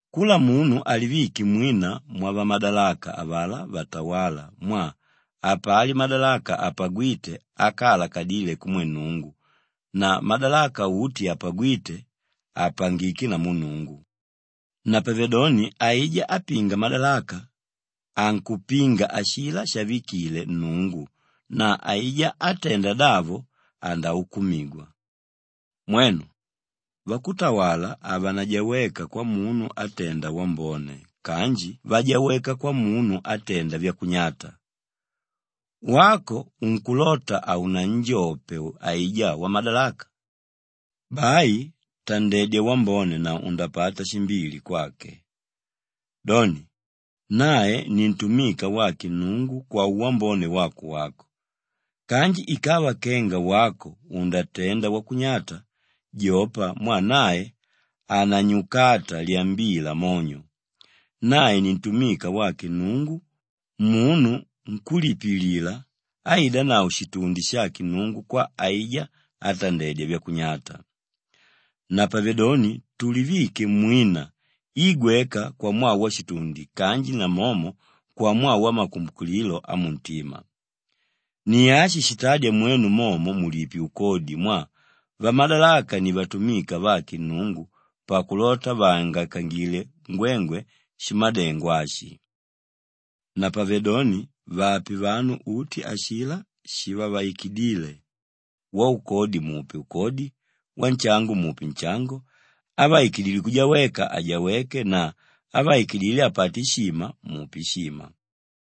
Kula munu alivike mwina mwavamadalaka avalá vatawála mwaa hapali madalaka apagwíte ákaalakadile kumwe Nnungu na madalaka uti apagwíte, apangiké namu Nnungu. Napavedoni aijá ápinga madalaka, ankupinga ashilá shavikile Nnungu na aijá átenda davo andaukumigwa. Mwenu, vakutawala havanajaweka kwamunu átenda wambone kanji vajaweka kwamunu átenda vyakunyata. Wako unkulota haunanjope aijá wamadalaka? Bai tandedya wambone na undapata shimbili kwake. Doni, nae ni ntumika wake Nnungu kwauwambone wako wako. Kanji ikava kenga wako undatenda wakunyata, jopa mwaa nae hananyukata lyambila monyo. Nae ni ntumika wake Nnungu, munu nkúlipilila áidanavo shitundi shake Nnungu kwa aijá átandedya vyakunyata. Napavedoni tulivike mwina i gweka kwamwaa washitundi kanji namomo kwamwaa wamakumbukililo amuntima. Ni ashi shitádya mwenu momo mulipe ukodi mwaa vamadalaka ni vatumika vake Nnungu pakulota vaangaikangile ngwengwe shimadengo ashi. Napavedoni, vape vanu uti ashilá shivavaikidíle: waukodi mupe ukodi, wanshango mupe nshango, ávaikidile kujaweka ajaweke na ávaikidile apate ishima, mupe ishima.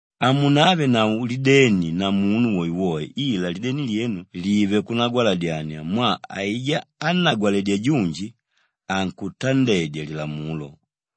Hamunavenavo lideni na munu woewoe ila lideni lyenu live kunagwaladyania mwaa aijá ánnagwaledya junji, ankutandedya lilamulo.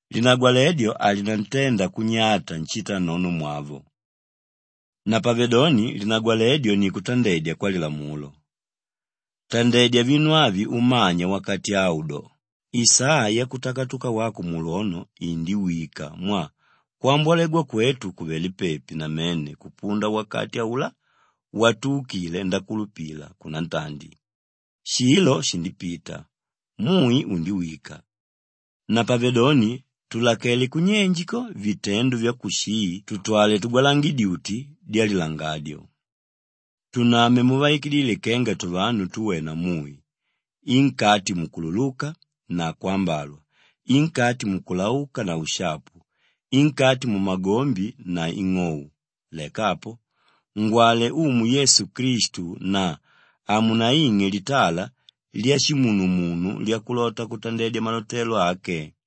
Linagwaledyo halinantenda kunyata nshitanonomwavo. Napavedoni linagwaledyo ni kutandedya kwalilamulo. Tandedya vinu avi umanya wakati au do, isaa yakutakatuka wako mulwono indiwika mwaa kwambolegwa kwetu kuvelé pepi namene kupunda wakati aulá watuukile ndakulupila kunantandi. Shilo shindipita, mui undiwika. Napavedoni tulakele kunyenje ko vitendo vyakushii tutwale tugwalange dyuti dyalilangadyo. Tuname muvaikidíle kenga tuvanu túwena mui, i nkati mukululuka na kwambalwa, i nkati mukulauka na ushapu, i nkati mumagombi na ing'ou. Leka apo, ngwale Umu Yesu Klistu na hamunaing'e litala lyashimunumunu lyakulota kutandedya malotelo ake.